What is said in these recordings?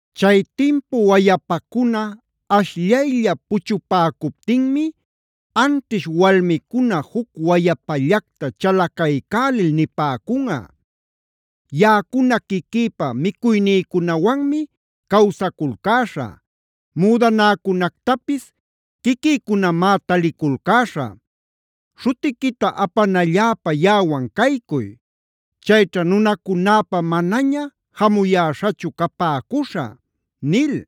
Chay timpu wayapacuna ashllaylla puchupäcuptinmi anćhish walmicuna juc wayapallacta chalacaycälil nipäcunꞌa: “Yaꞌacuna quiquïpa micuynïcunawanmi cawsaculcäśhä; müdanäcunactapis quiquïcunamá taliculcäśhä. Śhutiquita apanalläpa yaꞌawan caycuy. Chayćha nunacunäpa manaña jamuyäśhachu capäcuśhä” nil.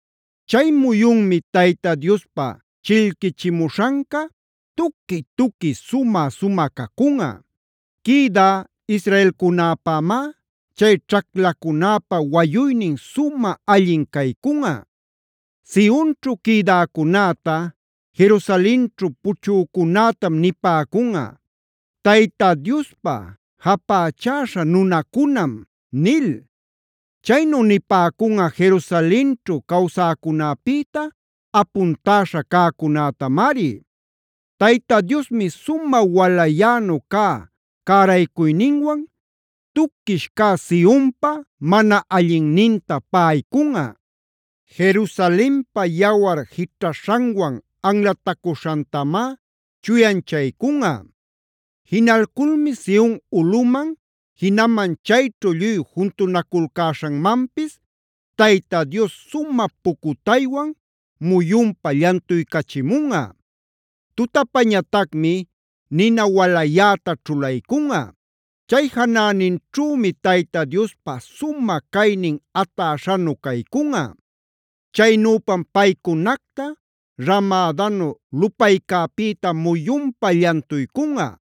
Chay muyunmi Tayta Diospa chillquichimuśhanca, tuqui-tuqui, sumä-sumä cacunꞌa. Quïdä israelcunäpämá chay ćhaclacunäpa wayuynin sumä allin caycunꞌa. Sionćhu quïdäcunäta, Jerusalenćhu puchücunätam nipäcunꞌa: “Tayta Diospa japächäśha nunacunam” nil. Chaynu nipäcunꞌa Jerusalenćhu cawsäcunäpïta apuntäśha cäcunätamari. Tayta Diosmi sumä walayänu cä cäraycuyninwan tuquish cä Sionpaa mana allinninta paꞌaycunꞌa; Jerusalenpa yawar jićhaśhanwan anlatacuśhantamá chuyanchaycunꞌa. Jinalculmi Sion ulꞌuman, jinaman chayćhu lluy juntunaculcäśhanmanpis, Tayta Dios sumä pucutaywan muyunpa llantuycachimunꞌa; tutapañatacmi nina walayäta ćhulaycunꞌa. Chay janäninćhümi Tayta Diospa sumä caynin atäśhanu caycunꞌa. Chaynüpam paycunacta ramädanu lupaycäpïta muyunpa llantuycunꞌa;